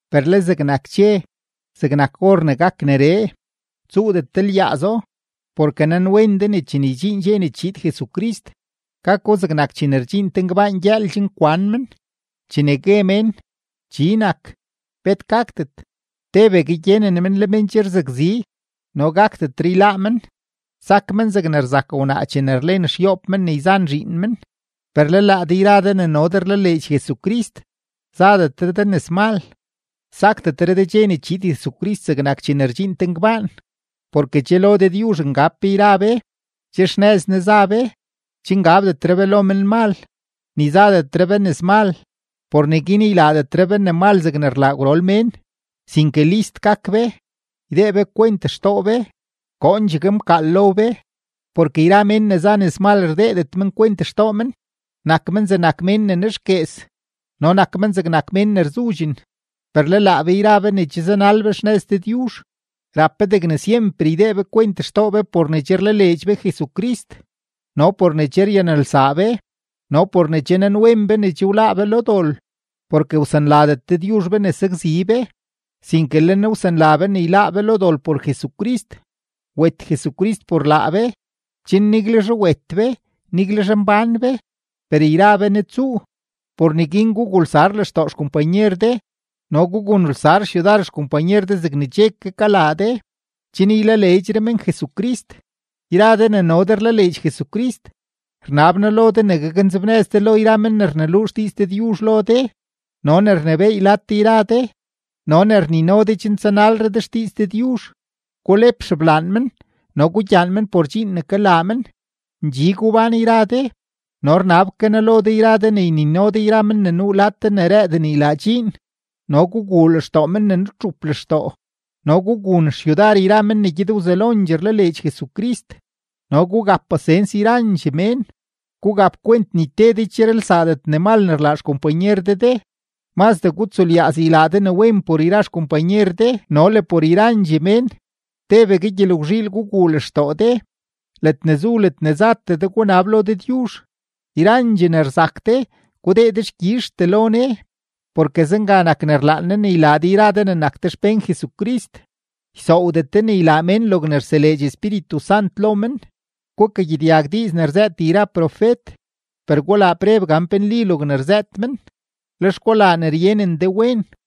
Per le zegnak dxe, zegnak or ne gak neree, tsuudet de lyaazo. Porke nanwen de ne chene ydxiin dxe ne chiid Jesucrist, gako zegnak chene rdxiin te ngbaan gyëël chen kwan men. Chene gue mén: “Chi nak, bet gakdet”, tebegue gyenen men le men che rzakzi no gakdetre yláá men, sak men zegne rzak wnaa chene rlen xyoob men ne yzan zhiin men. Per le laa de yra de ne no de rlaleedx Jesucrist, zadetre de nëzmal, sakdetre de dxe ne chiid Jesucrist zegnak chene rdxiin te ngbaan. Porke che lo Dëdyuzh ngab be yra be, che xnëz Ne za be; che ngabdetre be lo menmal, ni zadetre be nëzmal. Por neguin ylaadetre be ne mal zegne rlaa gwrol mén, sinke list gak be; ydee be kwent xtoo be, koondxegue mkaal lo be. Porke yra mén ne za nëzmal rdeedet men kwent xtoo men, nak men zegnak mén ne nexguees no nak men zegnak mén ne rzudxen. Per le laa be yra be ne che zanal be xnëz Dëdyuzh, rap be degne syemper ydee be kwent xtoo be por ne che rlaleedx be Jesucrist no por ne che ryanelsaa be no por ne che nanwen be ne che wláá be lo dol. Porke wsanladet Dëdyuzh be ne sakzi be, sinke le Ne wsanla be ne yláá be lo dol por Jesucrist. Wet Jesucrist por laa be, chen niguelzhe wet be, niguelzhe mbán be, per yra be Ne tsuu. Por neguin gugulsar lextoo xkompanyer de no gugunelsar xyudar xkompanyer de zegne che ke kalaa de, chen ylaleedxre men Jesucrist. Yra de ne no de rlaleedx Jesucrist, rnab noo lo de ne gaknzebnëz de lo yra men ne rneluu xdiiz Dëdyuzh lo de no ne rnebééy lad de yra de no ne rnino de chen tsanalre de xdiiz Dëdyuzh, gulep xeblaan men no gugyaan men por dxiin ne kalaa men. Ndxi gubán yra de. No rnab ke noo lo de yra de ne ynino de yra men ne nuu lad de ne rëëden ylaa dxiin, no guguu lextoo men ne nutxup lextoo, no gugun xyudar yra men ne gyed wzelondxee rlaleedx Jesucrist, no gugap pasens yrandxee mén. Gugap kwent ni te de ycherelsaadet ne mal ne rlaa xkompanyer de de. Mazdee gutsulyaaz ylaa de ne wen por yra xkompanyer de no le por yrandxee mén. Tebegue gyelgwzhiil guguu lextoo de, ledne zu ledne zatee de gunab lo Dëdyuzh, yrandxee ne rzak de, gudee dexkyizhtee lo Ne, porke zenga nak ne rlaan Ne ylaa de yra de ne nak de xpén Jesucrist. Ysoowdet de ne ylaa mén logne rseleedx Espíritu Sant lo men. Gukagyedyag diiz ne rzëët yra profet, per gulaa preb gan pe nli logne rzëët men, lex gulaa ne ryenen de wen.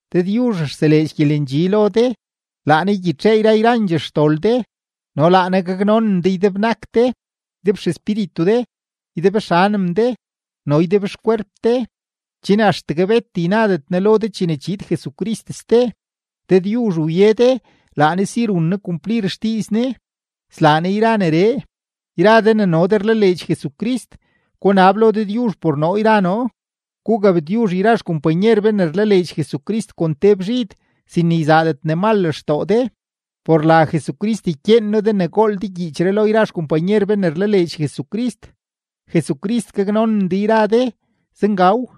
Dëdyuzh rseleedx gyelendxi lo de, laa Ne ygyitxee yra yrandxee xdol de, no laa Ne gaknonen de ydebnak de, ydebxespíritu de, ydebxanem de, no ydebxkwerp de, chen axtegue bet ynadet Ne lo de chene chiid Jesucrist ste. Dëdyuzh wye de, laa Ne si run Ne kumplir xdiiz Ne, slaa Ne yra neree. Yra de ne no de rlaleedx Jesucrist, gunab lo Dëdyuzh por noo yra noo. Gugabtyuzh yra xkompanyer be ne rlaleedx Jesucrist kon te bzhid, sin ne yzaadet ne mal lextoo de. Por la Jesucrist ykyeen noo de ne gool de gyiichree lo yrandxee xkompanyer be ne rlaleedx Jesucrist. Jesucrist gaknonen de yra de. Zengaw.